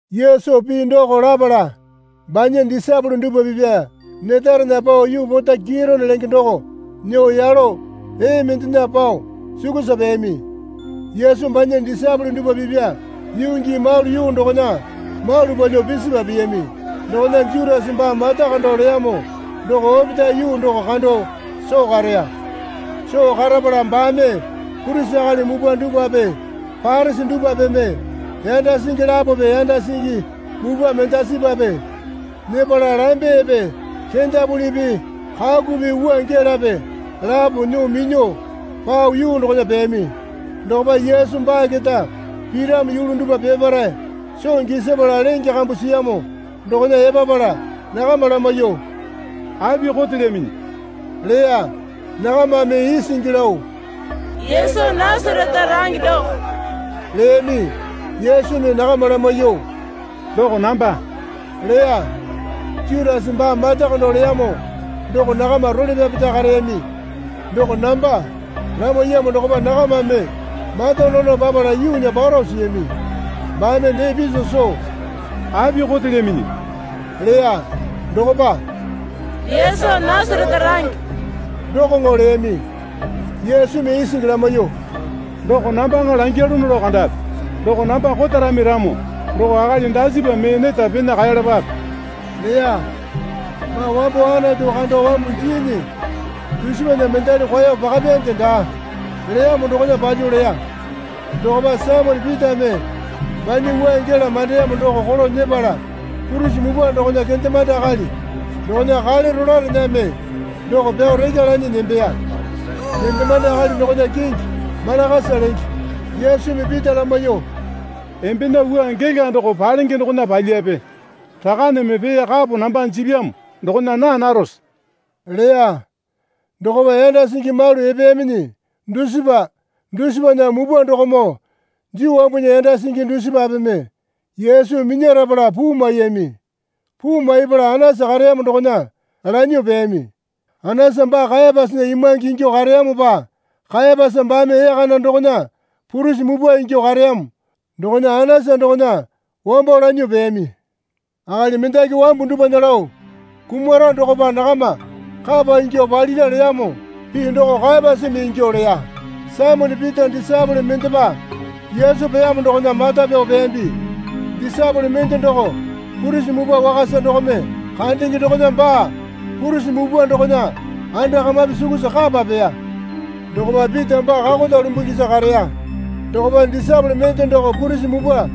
Yesu pii doko lapala banya disaepole dupwa pipya netarena pao yuu pota Kitone lenge doko nyuo yalo ee mendena pao sukusa peyami. Yesu banya disaepole dupwa pipya yuu gii malu yuu dokona malu palyuo pisipa piyami dokona Jutasa baa mata kando leyamo doko opetae yuu doko kando soo kareya. Soo karapala baame purisi akali mupwa dupwape Parisi dupwapeme yanda singi lapope yanda singi mupwa mendasipape nyepala lambepe kendapulipi kakupi wua gelape lapo nyuo minyuo pao yuu dokona peyami. Dokopa Yesu baa keta piramo yulu dupwa peparae soo gisapala lenge kambu siyamo dokona epapala nakama lamaiyuo, Api kotelyaminyi? leya. Nakamame isingi lao, Yesu Nasarete range doko, leyami. Yesumi nakama lamaiyuo, Doko namba, leya. Jutasa baa mata kando leyamo doko nakama role pyapeta kareyami. Doko namba, lamaiyamo dokopa nakamame matanono papala yuunya paro siyami. Baame dee piso soo, Api kotelyaminyi? leya. Dokopa, Yesu Nasarete range, dokoŋo leyami. Yesumi isingi lamaiyuo, Doko nambaŋa langyalono lao kandapi doko namba kotarami ramo doko akali dasipa mee neta pena kaeyalapape leya. Baa wambo Anatu kando wambu jiinyi dusipana mendali kwao pakapyande daa, leyamo dokona palyuo leya. Dokopa Saimone Pitame banya wua gela mandeyamo doko kolo nyepala purisi mupwa dokona kendemande akali dokona kale rolaerename doko pyao rekya lanyi nembeya. Kendemande akali dokona kingi Malakasa lenge. Yesumi Pita lamaiyuo, Embena wua gela doko palenge dokona palyape. Rakaneme pee kapo namba jipyamo dokona naa narose? leya. Dokopa yanda singi malu epeyaminyi dusipa dusipana mupwa dokomoo Juu wambunya yanda singi dusipapeme Yesu minyarapala puu maiyami. Puu maipala Anasa kareyamo dokona lanyuo peyami. Anasa baa Kayapasana imwange ingyuo kareyamopa Kayapasa baame ee kana dokona purisi mupwa ingyuo kareyamo dokona Anasa dokona wambo lanyuo peyami. Akali mendaki wambu dupwana lao kumara dokopa nakama kapa ingyuo palira leyamo pii doko Kayapasa ingyuo leya. Saimone Pita disaepole mendepa Yesu peyamo dokona mata pyao peyambi. Disaepole mende doko purisi mupwa wakasa dokome kandenge dokona baa purisi mupwa dokona anda kamapi sukusa kapa peya. Dokopa Pita baa kakota lumbungisa kareya. Dokopa disaepole mende doko purisi mupwa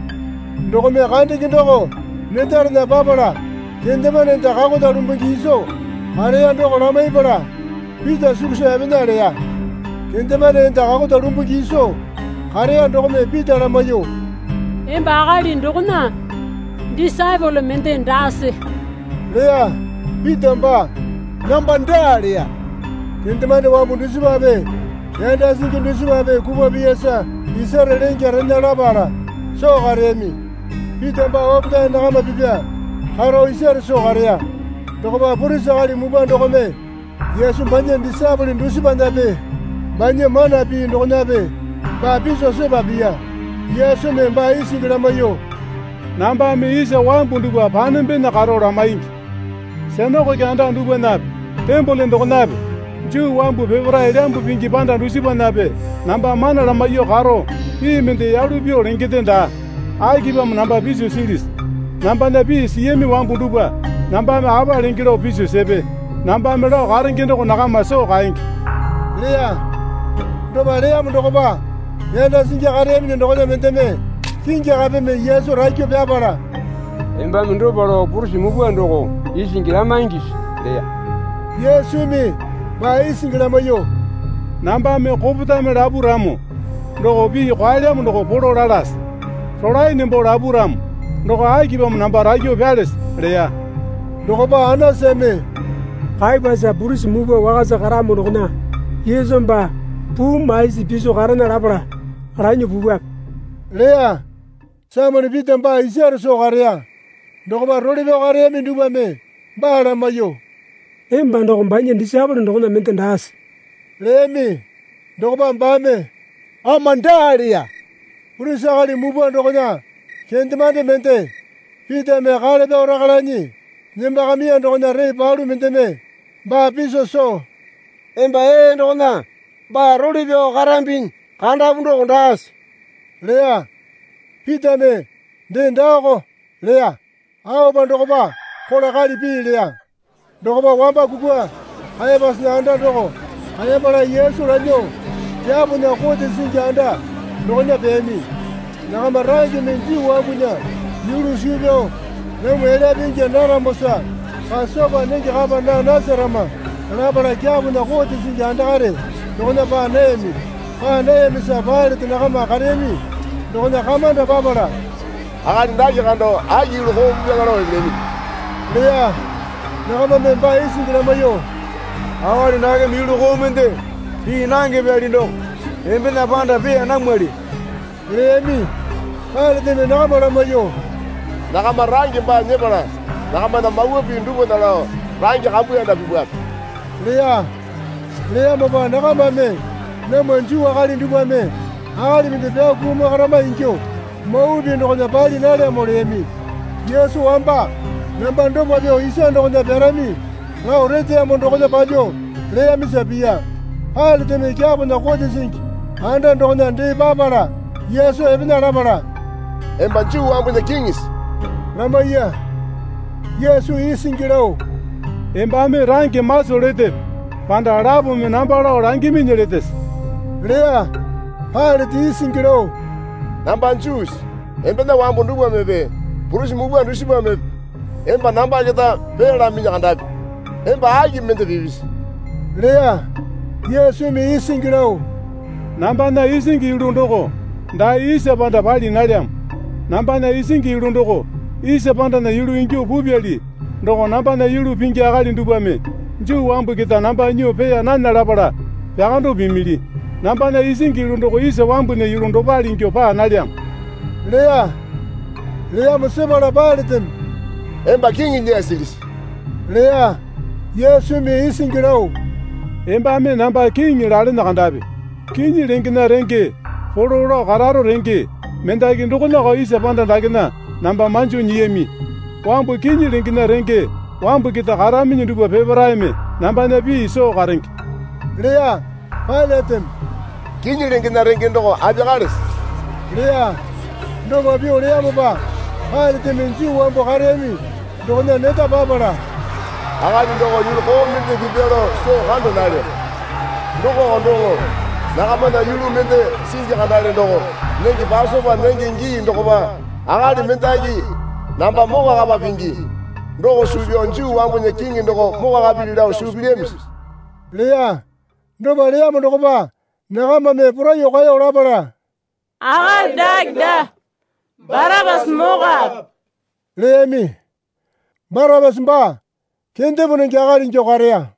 dokome kandenge doko netarena papala kendemande enda kakota lumbungi iso kareya doko lamaipala Pita sukusa epena leya. Kendemande enda kakota lumbungi isa kareya dokome Pita lamaiyuo, Emba akali dokona disaepole mende daase? leya. Pita baa, Namba daa, leya. Kendemande wambu dusipape yanda singi dusipape kupwa piyasa isare lengya rena lapala soo kareyami. Pita baa opetae nakama pipya karo isare soo kareya. Dokopa purisi akali mupwa dokome Yesu banya disaepole dusipanape banya mana pii dokonape baa piso sepa piya. Yesumi baa isingi lamaiyuo, Nambame isa wambu dupwa panembena karo lamaingi, sinakoke anda dupwanape tembole dokonape Juu wambu peparae elyambu pingi panda dusipanape namba mana lamaiyuo karo pii mende yalu pyuo lengende daa. Akipamo namba piso silisi? Nambana pii siyami wambu dupwa nambame apa lenge lao piso sepe. Nambame lao karenge doko nakama soo kaenge, leya. Dopa leyamo dokopa yanda singi kareyaminyi dokona mendeme kingi kapeme Yesu rakyuo pyapala, Embame dopa lao purisi mupwa doko isingi lamaingisi? leya. Yesumi baa isingi lamaiyuo, Nambame kopetame lapu ramo doko pii kwaelyamo doko polo lalase. Rolae nembo lapu ramo doko akipamo namba rakyuo pyalese? leya. Dokopa Anasame, Kayapasa purisi mupwa wakasa karamo dokona Yesu baa puu maisi piso karena lapala lanyuo pupwape, leya. Saimone Pita baa isare soo kareya. Dokopa role pyao kareyami dupwame baa lamaiyuo, Emba doko banya disaepole dokona mende daase? leyami. Dokopa baame, Ama daa leya. Purisi akali mupwa dokona kendemande mende Pitame kale pyao rekya lanyi nembakamiya dokona ree palu mendeme baa piso soo, Emba ee dokona baa role pyao karambinyi kandapu doko daase? leya. Pitame dee Daako, leya. Aopa dokopa kola kali pii leya. Dokopa wamba kukwa Kayapasana anda doko kaepala Yesu lanyuo kyapona kote singi anda dokona peyami. Nakama rangeme Juu wambunya yulu suu pyao namwa elyape ingya naramosa Pasopa nenge kapa naa nasarama lapala kyapona kote singi andakare dokona paa nayami. Paa nayamisa Pailate nakama kareyami dokona kamanda papala, Akali dake kando aki yulu koo pipyaŋa lao epelyaminyi? leya. Nakamame baa isingi lamaiyuo, Akali dakeme yulu koo mende pii nange pyali doko embena panda peeya namwali leyami. Pailateme nakama lamaiyuo, Nakama range baa nyepala nakamana mawa pii dupwana lao range kambuyanda pipwape leya. Leyamopa nakamame namwa Juu akali dupwame akali mende pyao kumakarama ingyuo mawa pii dokona pali nalyamo leyami. (Yesu wamba namba dopa pyuo isa dokona pyarami lao reteyamo dokona palyuo leyamisa piya.) Pailateme kyapona kote singi anda dokona dee papala Yesu epena lapala, Emba Juu wambunya Kiŋisi? lamaiya. Yesu isingi lao, Embame range maso letepe panda lapome namba lao langiminyi letese? leya. Pailate isingi lao, Namba Juusi? Embena wambu dupwamepe purisi mupwa dusipamepe emba namba keta peeyalaminyi kandapi. Emba aki mende pipisi? leya. Yesumi isingi lao, Nambana isingi yulu doko dae isa panda pali nalyamo. Nambana isingi yulu doko isa pandana yulu ingyuo pupyali doko nambana yulu pingi akali dupwame Juu wambu keta namba nyuo peeya nana lapala pyakando pimili. Nambana isingi yulu doko isa wambunya yulu dopale ingyuo paa nalyamo leya. Leyamo sepala Pailateme Emba kiŋi lyasilisi? leya. Yesumi isingi lao, Embame namba kiŋi lalene kandapi. Kinyi lengena renge polo lao kararo renge mendaki dokonako isa panda dakena namba manjo nyiyami. Wambu kinyi lengena renge wambu keta karaminyi dupwa peparaeme nambana pii soo karenge, leya. Pailateme, Kinyi lengena renge doko apiyakalese? leya. Dopa pyuo leyamopa Pailateme Juu wambu kareyami dokona neta papala, Akali doko yulu koo mende pipya lao soo kanda nalyo. Dokoko doŋo nakamana yulu mende singi kandale doko nenge Pasopa nenge gii dokopa akali mendaki namba mokwakapa pingi. Doko suu pyao Juu wambunya Kiŋi doko mokwakapili lao suu pilyamisi? leya. Dopa leyamo dokopa nakamame poraiyuo kaeyo lapala, Akali dake daa, Barapasa mokape, leyami. Barapasa baa kendepo nenge akali ingyuo kareya.